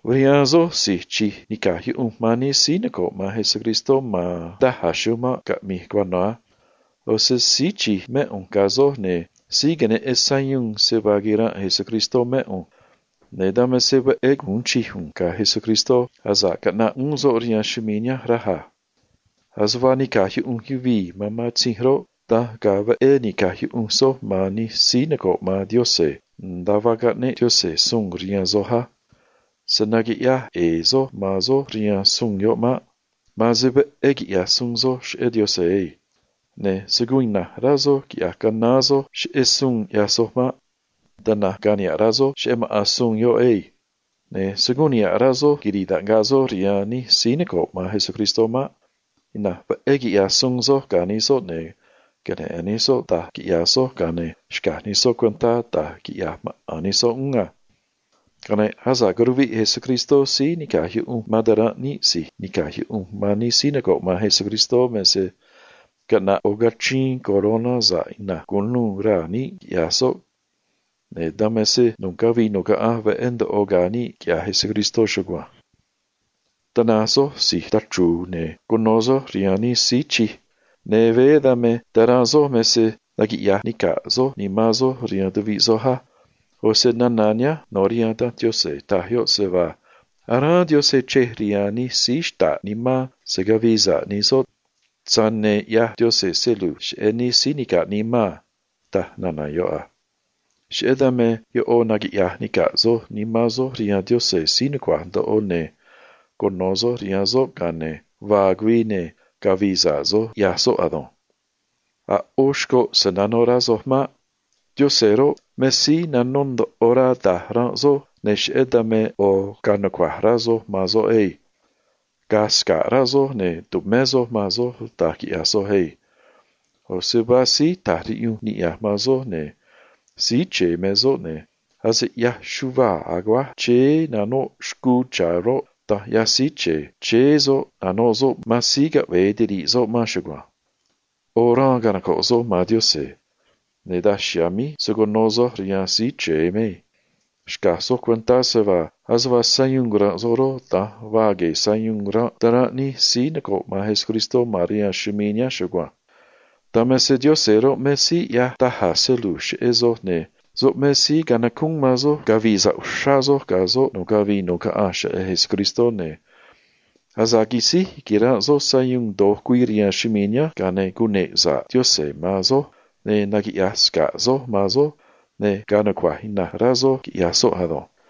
Rihaan soj si̱j tumé sa̱ꞌ rihaan Yaꞌanj man nij síí noco̱ꞌ man Cristó ma̱n da̱j a̱ chumanꞌ caꞌmi̱i̱ nu̱cuáj cuano̱ a. ꞌO̱ se síí tumé sa̱ꞌ rihaan Yaꞌanj man yuvii̱ mé ꞌu̱nj ga̱ soj, ne̱ síí queneꞌen sayuun se vaa quiranꞌ Cristó mé ꞌu̱nj, ne̱ dan me se veꞌé gu̱un chij ꞌu̱nj ga̱ Cristó asa̱ꞌ curuviꞌ uún soꞌ rihaan chumii̱ nihánj, raj a. Ase vaa nica̱j yuꞌunj yucuáj man matzinj roꞌ, da̱nj ga̱a̱ veꞌé ni̱caj yuꞌunj soj man nij síí noco̱ꞌ man Yaꞌanj nda̱a vaa caꞌneꞌ Yaꞌanj suun rihaan soj á. Se̱ naquiꞌyaj ꞌe̱e̱ soj man soj rihaan suun yoꞌ maꞌ. Ma̱an se veꞌé gu̱un rá soj quiꞌya̱j soj se‑su̱u̱n Yaꞌanj ado̱nj. Ne̱ se̱ guun ina̱nj rá soj quiꞌya̱j canaán soj saꞌanj cheꞌé suun ꞌyaj soj maꞌ. Tana̱nj ga̱a̱ niha̱ꞌ rá soj cheꞌé maꞌa̱n suun yoꞌ á. Ne̱ se̱ guun niha̱ꞌ rá soj quiri̱i̱ taꞌngaꞌ soj rihaan nij síí nica̱j yuꞌunj soj man maꞌ. Ina̱nj veꞌé quiꞌya̱j soj ga̱ nij soꞌ, ne̱ queneꞌe̱n nij soꞌ da̱j ꞌyaj soj, ga̱a ne̱ xca̱j nij soꞌ cuentá da̱j quiꞌya̱j maꞌa̱n nij soꞌ uún a. Ga̱a ne̱ asa̱ꞌ curiha̱nj Síí Nica̱j Yuꞌunj man ta̱ranꞌ níꞌ si̱j tumé sa̱ꞌ rihaan Yaꞌanj man nij síí noco̱ꞌ man Cristó me se caꞌna̱ꞌ ꞌo̱ cachriin coroná sa̱ꞌ ina̱nj cu̱nuû raa̱ níꞌ, quiꞌya̱j soꞌ, ne̱ dan me se nu̱ꞌ cavii nu̱ꞌ caꞌanj niꞌndaj ya̱ veꞌé ga̱a̱ níꞌ, quiꞌya̱j Cristó chugua̱nj. Da̱nj na̱nj soj si̱j tachru̱u̱, ne̱ cuno̱ soj rihaan nij síí chij, ne̱ ta̱ranꞌ soj me se naquiꞌya̱j nica̱ꞌ soj nimán soj rihaan tuviꞌ soj á. ꞌO̱ se nana̱ nihánj nó rihaan Danj Yaꞌanj, taj yoꞌ a: Aráán Yaꞌanj chrej rihaan nij síí xta̱ꞌ nimán se̱ cavii sa̱ꞌ nij soꞌ, tza̱j ne̱ ꞌyaj Yaꞌanj se lu̱j ga̱ nij síí nica̱ꞌ nimán a, taj nana̱ yoꞌ a. Cheꞌé dan me ꞌo̱ naquiꞌya̱j nica̱ꞌ soj nimán soj rihaan Yaꞌanj si̱j nucua̱j ndoꞌo uxrá, ne̱ cuno̱ soj rihaan soꞌ, ga̱a ne̱ vaa güii, ne̱ cavi̱i̱ sa̱ꞌ soj, quiꞌya̱j soꞌ ado̱nj. A̱ ꞌó xcoꞌ se̱ nanó rá soj maꞌ. Yaꞌanj roꞌ, me síí nanó ndoꞌo rá da̱j ranꞌ soj, ne̱ cheꞌé dan me ꞌo̱ ga̱a̱ nucua̱j rá soj man soꞌ ado̱nj. Ga̱a̱ sca̱ꞌ rá soj, ne̱ tu̱mé soj man soj da̱j quiꞌya̱j soj á. ꞌO̱ se vaa síí ta̱j riꞌyunj niꞌya̱j man soj, ne̱ Síí Chre̱e me soꞌ, ne̱ ase ꞌyaj chuvaa̱ aguáj chéé nanoꞌ xcuu cha̱ roꞌ, da̱nj ꞌyaj Síí Chre̱e, chéé soꞌ nanoꞌ soꞌ man síí caꞌve̱e tiri̱ꞌ soꞌ man chugua̱nj. ꞌO̱ xraan canoco̱ꞌ soj man Yaꞌanj, ne̱ daj chiha̱a̱ míj se̱ cuno soj rihaan Síí Chre̱e maꞌ. Xca̱j soj cuentá se vaa ase vaa sayuun ranꞌ soj roꞌ, da̱nj vaa gue̱e̱ sayuun ranꞌ ta̱ranꞌ nij síí noco̱ꞌ man Cristó ma̱n rihaan chumii̱ nihánj chugua̱nj. Dan me se Yaꞌanj roꞌ, me síí ꞌyaj da̱j a̱ se lu̱j cheꞌé soj, ne̱ soꞌ me síí canacúún man soj cavi̱i̱ sa̱ꞌ uxrá soj ga̱ soꞌ nu̱ꞌ cavii nu̱ꞌ caꞌanj cheꞌé Cristó ado̱nj. Asa̱ꞌ quisíj quiranꞌ soj sayuun do̱j güii rihaan chumii̱ nihánj, ga̱a ne̱ naquiꞌya̱j sa̱ꞌ Yaꞌanj man soj, ne̱ naquiꞌya̱j sca̱ꞌ soꞌ man soj, ne̱ ga̱a̱ nucua̱j ina̱nj rá soj, quiꞌya̱j soꞌ, ne̱ cune̱ꞌ sa̱ꞌ soꞌ man soj ado̱nj.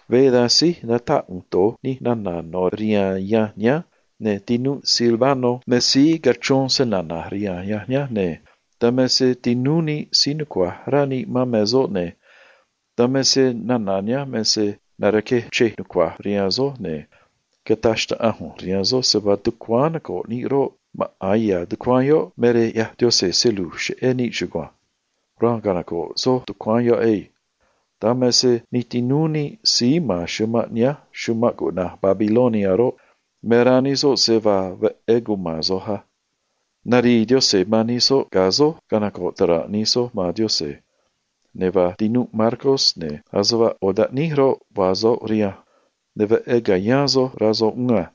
Veé da̱nj síj natáꞌ ꞌu̱nj do̱j nij nana̱ no̱ rihaan yanj nihánj, ne̱ tinúꞌ Silvano me síí cachrón snana̱j rihaan yanj nihánj, ne̱ dan me se tinúú níꞌ síí nucua̱j rá níꞌ man me soꞌ a. Dan me se nana̱ nihánj me se narquej chrej nucua̱j rihaan soj, ne̱ cataj xnaꞌanj ꞌu̱nj rihaan soj se vaa tucuáán noco̱ꞌ níꞌ roꞌ, maꞌa̱n ya̱ tucuáán yoꞌ me rej ꞌyaj Yaꞌanj se lu̱j cheꞌé níꞌ chugua̱nj. Raan canoco̱ꞌ soj tucuáán yoꞌ á. Dan me se xꞌneꞌ nij tinúú níꞌ síí ma̱n chumanꞌ nihánj chumanꞌ cuꞌna̱j Babilonia roꞌ, me rá nij soꞌ se vaa veꞌé cuma̱n soj a. Narii Yaꞌanj man nij soꞌ ga̱ soj canoco̱ꞌ ta̱ranꞌ nij soj man Yaꞌanj, ne̱ vaa tinúꞌ Marcos, ne̱ ase vaa ꞌo̱ taꞌníj roꞌ, vaa soꞌ rihanj, ne̱ veꞌé ca̱yáán soj, rá soꞌ uún a.